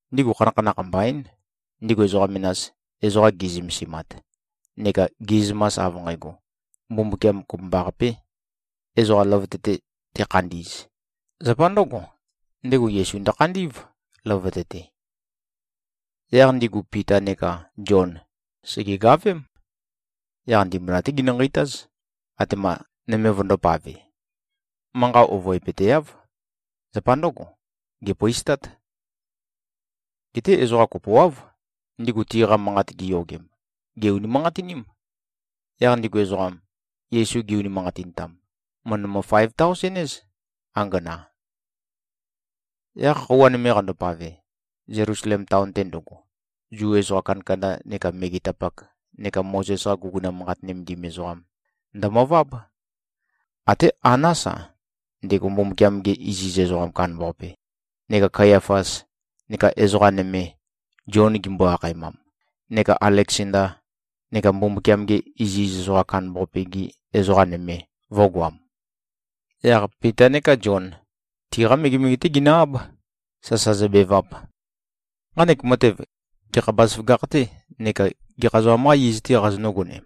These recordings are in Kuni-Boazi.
Ndigu khanakhanakh mbaín, ndigu ezoqa menas, ezoqa gi꞉zømesimat, neka gi꞉zømas, av nqægo, Mbumbukiam kopømbaqapē ezoqa løvøte-te tekhandi꞉z, zapa ndø̄go, ndego Yesu ndøkhandī꞉v, løvøte-te. Yaq ndigu Pita neka Zion sègegavém. Yaq ndimbula-té genø-nqeitáz, atema nøme vøndōpave. Manqa ovøepøteáv. Zapa ndǿgo, gèpøistát. Geté ezoqa kopoáv, ndigu tiqa manqat giyogem, gè-unimanqatiním. Yaq ndigu ezoqam, Yesu gi-unimanqatintam, mø̀ndømø-faev-taosen-éz, angana. Yaq khøuwa nøme qandopave, Zelusalem taon-te ndøgo, Zu ezoqa kandakanda neka megetapak neka Mozes-qa guguna manqat nømendim ezoqam ndømøváb. Até Anás-a, ndego Mbumbukiam-ge iziz ezoqam kandambaqape, neka Kayafas, neka ezoqa nøme, Zion gimbo-akhaemam, neka Aleksanda, neka Mbumbukiam-ge iziz ezoqam kandambaqape-gi ezoqa nøme, vø̄goam. Yaq Pita neka Zion, tiqa megemege-té ginø-áb, sasa zøbevap, “Nqanek matev, gekha bazaføgakh-tē neka gekha ezoqam-qâ iz-tē qazonǿ-gonem?”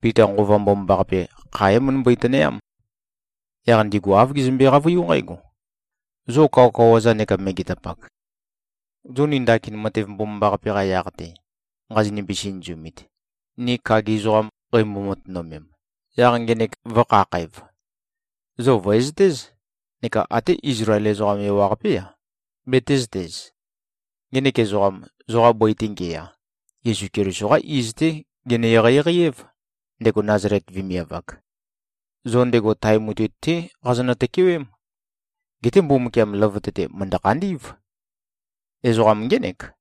Pita, Nqova Mbomambaqape kha é-møndømbøi-tønøyám. Yaq ndigu āv gezømbe-qavøiú nqǽgo, “Zo kawakawa-za neka megetapak! Zo ni ndakin matev mbomambaqape-qa yaq-te nqazonimbi-sinøzumit, ni kagi ezoqam qeimbo-matønømem, yaq ngenek vø̄khakhæv, zo vø̀ezøtéz neka até Izlael ezoqam ewaqapé-a, betēzøtez: Ngenek ezoqam, zoqa bøi-te ngeya, Yesu Keliso-qá iz-té gene-eqeieqei-év, ndego Nazalet vemiav-ak. Zo ndego tae mutui-té qazonø-tøkewém. Geté Mbumbukiam løvøte-te mø̀ndø-khandí꞉v. Ezoqam ngének,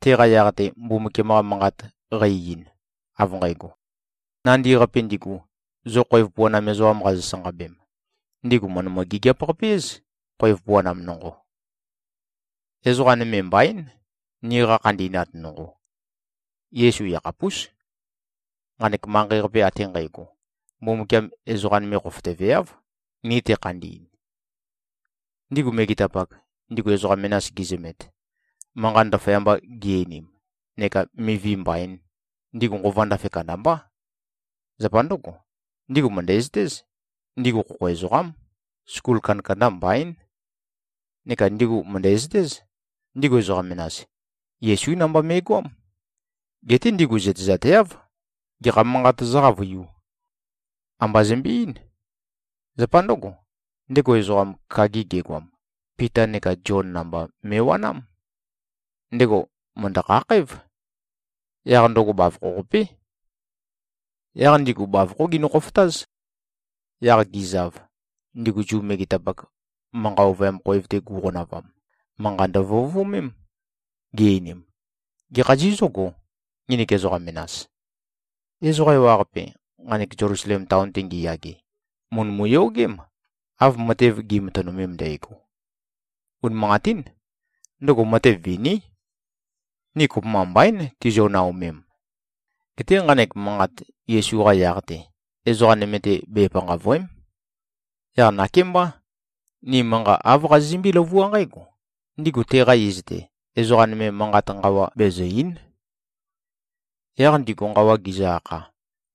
teqa yaq-te Mbumbukiam-qa Manqat qæ-ein, av nqægo, ‘Nandi-qapi ndigu, zo khoev puanam ezoqam qazo-sanqabem, ndigu mø̀ndømø-gigiap-qape-éz, khoev puanam nonqo.’ Ezoqa nøme mbaín, niqa khandi꞉nat nonqo. Yesu yakhapús. Nqanek manqei-qape ate nqægo, Mbumbukiam ezoqa nøme khofotøveáv, ni tekhandi꞉n.” Ndigu megetapak, ndigu ezoqa menas gizømet, manqat ndaføyamba gi-einim neka mivi mbaīn, ndigu nqova ndafe kandambá. Zapa ndǿgo, ndigu mø̀ndæzøtéz, ndigu khokho ezoqám, skul kandakanda mbaín. Neka ndigu mø̀ndæzøtéz, ndigu ezoqa menas, Yesú namba me꞉goám. Geté ndigu zøtezateáv, gekha manqat zǿqavøiū. Amba zømbe-eín. Zapa ndǿgo, ndego ezoqam, kagi gegoam, Pita neka Zion namba me꞉wanám. Ndego mø̀ndø-khakhǽv. Yaq ndøgo bavokho-qapé. Yaq ndigu bavokhó ginø-khofotáz. Yaq gizav, ndigu Zu megetapak, manqa ovøyam khoev-te gu꞉qonavam, manqa ndøvøovømém. Gi-einim, “Gekha zizǿgō, nginik ezoqa menas? Ezoqa ewaqape, nqanek Zelusalem taon-te ngiyage, mø̀ndømu-yogém, av matev gi꞉matønømem ndægo. Unimanqatín. Ndøgo matev viní. Ni kopømba mbaín tizio-naomem. Geté nqanek manqat Yesu-qa yaq-te, ezoqa nøme-te, bepanqàvøe᷄m. Yaq nakémbá. Ni manqa āv qazizømbé-løvuá nqǽgo, ndigu teqa iz-te, ezoqa nøme manqat nqawa bezø̀-ei᷄n.” Yaq ndigu nqawa gizø-akha,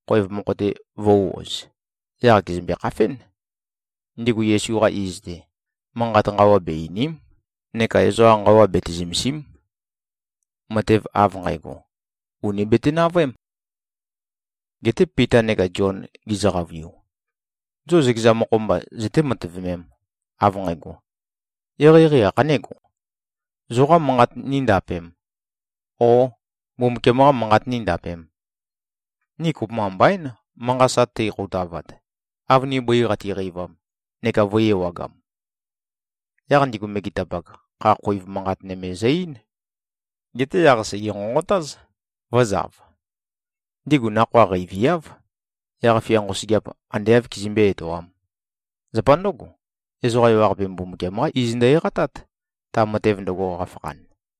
khoev mokho-te vø̄u-oz, yaq gèzømbe-khafén. Ndigu Yesu-qa iz-te, manqat nqawa be-eìni᷄m, neka ezoqa nqawa bete-zømèsi᷄m! Matev av nqægo, ùni bete-navøém! Geté Pita neka Zion gizø-qavøiu, “Zo zøkeza mokho-mba, zøté-matøvømēm, av nqægo. Eqeieqei ākhanégo? Zoqâ manqat níndapēm, ó, Mbumbukiam-qā manqat níndapēm? Ni kopømba mbaín, manqa sa teikhoutavat, av ni bøi qatiqeivam, neka vø̄i-ewagam.” Yaq ndigu megetapak, kha-khoiv manqat nøme zø-eín. Geté yaq sège-nqonqotáz, vø̄zav. Ndigu nakhoa qeiviáv, yaq-fia nqosøgeap ande āv kizømbé-etoām. Zapa ndǿgo, ezoqa ewaqape Mbumbukiam-qá iz ndø-eqatát, ta matev ndøgo, qafakhan.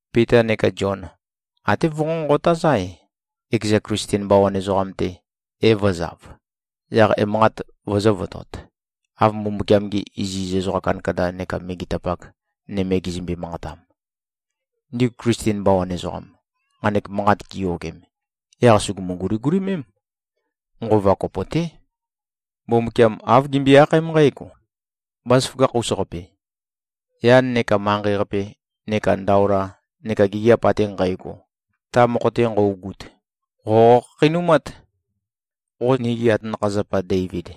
Pita neka Zion até vønqonqotáz-ae, ekeza Klisten bawan ezoqam-te e-vø̄zav, yaq emanqat vøzø̄votot, av Mbumbukiam-gi iziz ezoqa kandakanda neka megetapak nøme gizømbe-manqatam. Ndigu Klisten bawan ezoqam, nqanek manqat giyogem, yaq sùgumu-guligulimém. Nqova kopo-té. Mbumbukiam āv gimbøe-akhaém nqǽgo, “Bázaføgakh-us-qape. Yan neka manqei-qape neka ndaola, neka gigiap ate nqægo, ta mokho-te nqøugut, qo qokhakheinumát. Qo nigi atanakha-zapa Deivid,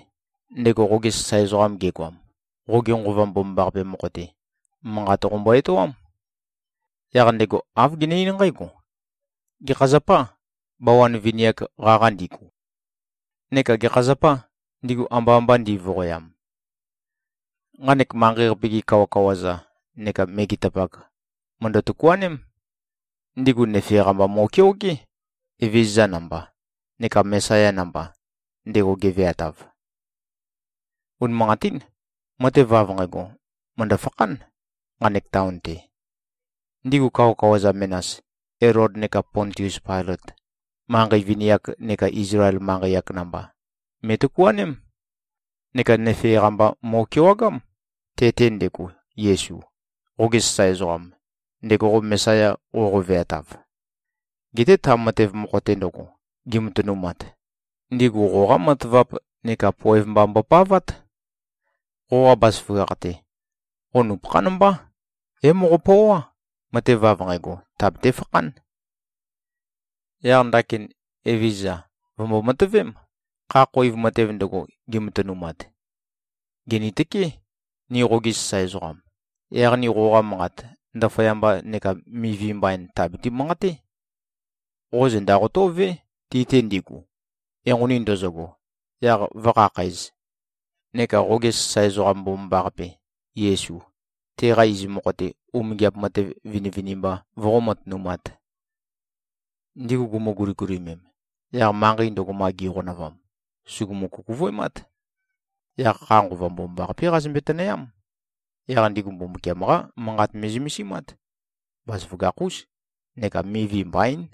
ndego qoge sasae ezoqam gegoam, qoge Nqova Mbomambaqape mokho-te, manqat qombo-etoám. Yaq ndego āv gene-eín nqǽgo, ‘Gekha zapâ, bawan vini-ak qaqa ndigu? Neka gekha zapâ, ndigu amba mba ndi꞉voqoyam? Nqanek manqei-qape-gi kawakawa-za neka megetapak mø̀ndø-tøkuaném. Ndigu nøfe-qa mba mo꞉keogé, Evezøza namba, neka Mesaya namba, ndego geveatav.’ Unimanqatín. Matev av nqægo, mø̀ndø-fakhán, nqanek taon-te. Ndigu kawakawa-za menas, Elod neka Pontius Pailøt, manqei vini-ak neka Izlael manqei-ak namba me꞉tøkuaném. Neka nøfe-qa mba mo꞉kewagám, te-te ndego, Yesu, qoge sasae ezoqam, ndego qo Mesaya qoqo-veatav. Geté ta matev mokho-te ndøgo, gimatønumat, ndigu qoqá matavap neka poev mba mbopavát. Qoqa bazaføgakh-te, qo nupøkhán mbá, é-moqopøoá, matev av nqægo tàbete-fakhán. Yaq ndakin, Evezøza, vø̀mbo-matøvém, kha-khoiv matev ndøgo, gimatønumat. Gìnitøké, ni qogi sasae ezoqam, yaq ni qoqa manqat, ndaføyamba neka mivi mbain tàbati-manqaté. Qo zenda qotó꞉vé, ti-te ndigu, enqoni ndøzøgo, yaq vǿkhakhǣz. Neka qoge sasae ezoqam mbomambaqape, Yesu, teqa iz mokho-te, umingiap matev vinivinimba voqó-matønumāt.” Ndigu gumu-guligulimem, yaq manqei ndøgo, ma gi꞉qonavam, sùgumu-kukuvøemát. Yaq kha Nqova Mbomambaqapé qazømbe-tønøyám. Yaq ndigu Mbumbukiam-qá Manqat me꞉zømesimát. Bazaføgakh-ús neka mivi mbaín.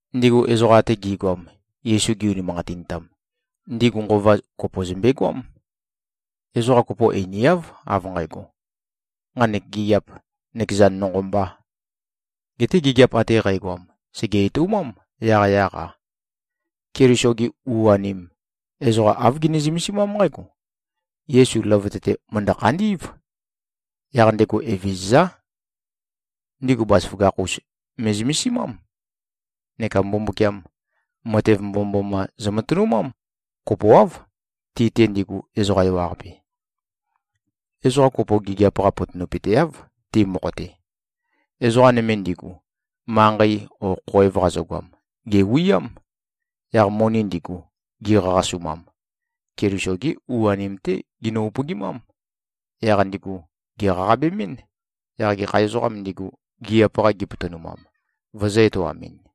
Ndigu ezoqa ate gi꞉goam, Yesu gi-unimanqatintam, ndigu nqova kopo zømbegoám. Ezoqa kopo einiáv, av nqægo, “Nqanek gigiap, nøkeza nonqo mbā.” Geté gigiap ate qægoam, sège-etoumám, yaqyaq-a. Keliso-gi u-anim, ezoqa āv gini-zømesimám nqǽgo: Yesu løvøte-te mø̀ndø-khandí꞉v. Yaq ndego Evezøzá. Ndigu bazaføgakh-us me꞉zømesimám. Neka Mbumbukiam, matev mbomømboma zømatønumám, kopoáv, ti-te ndigu, ezoqa ewaqape. Ezoqa kopo gigiap-qa potonøpøteáv, ti mokho-te. Ezoqa nøme ndigu, manqei o khoev qazøgoam, gèwiám. Yaq moni ndigu, gi꞉qaqasumam, Keliso-gi u-anim-té ginø-upøgimám. Yaq ndigu gèqaqabemɨ́n, yaq gekha ezoqām ndigu, gigiap-qa gipotonumam, vøzø̄-etoamɨn.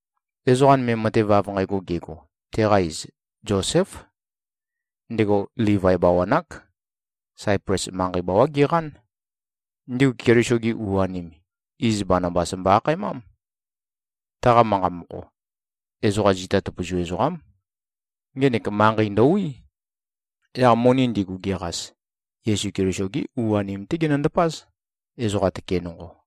Ezoqa nøme, matev av nqægo gego, teqa iz Zoséf. Ndego Livai bawan-ák. Saiples manqei bawá geqán. Ndigu Keliso-gi u-anim, iz Banabas mbo-akhaemám. (Taqa manqa mokho, “Ezoqa zita tøpøzu ezoqám.”) Ngenek manqei ndøwí. Yaq moni ndigu, geqas, Yesu Keliso-gí u-anim-té genøndapáz, ezoqa tøke nonqo.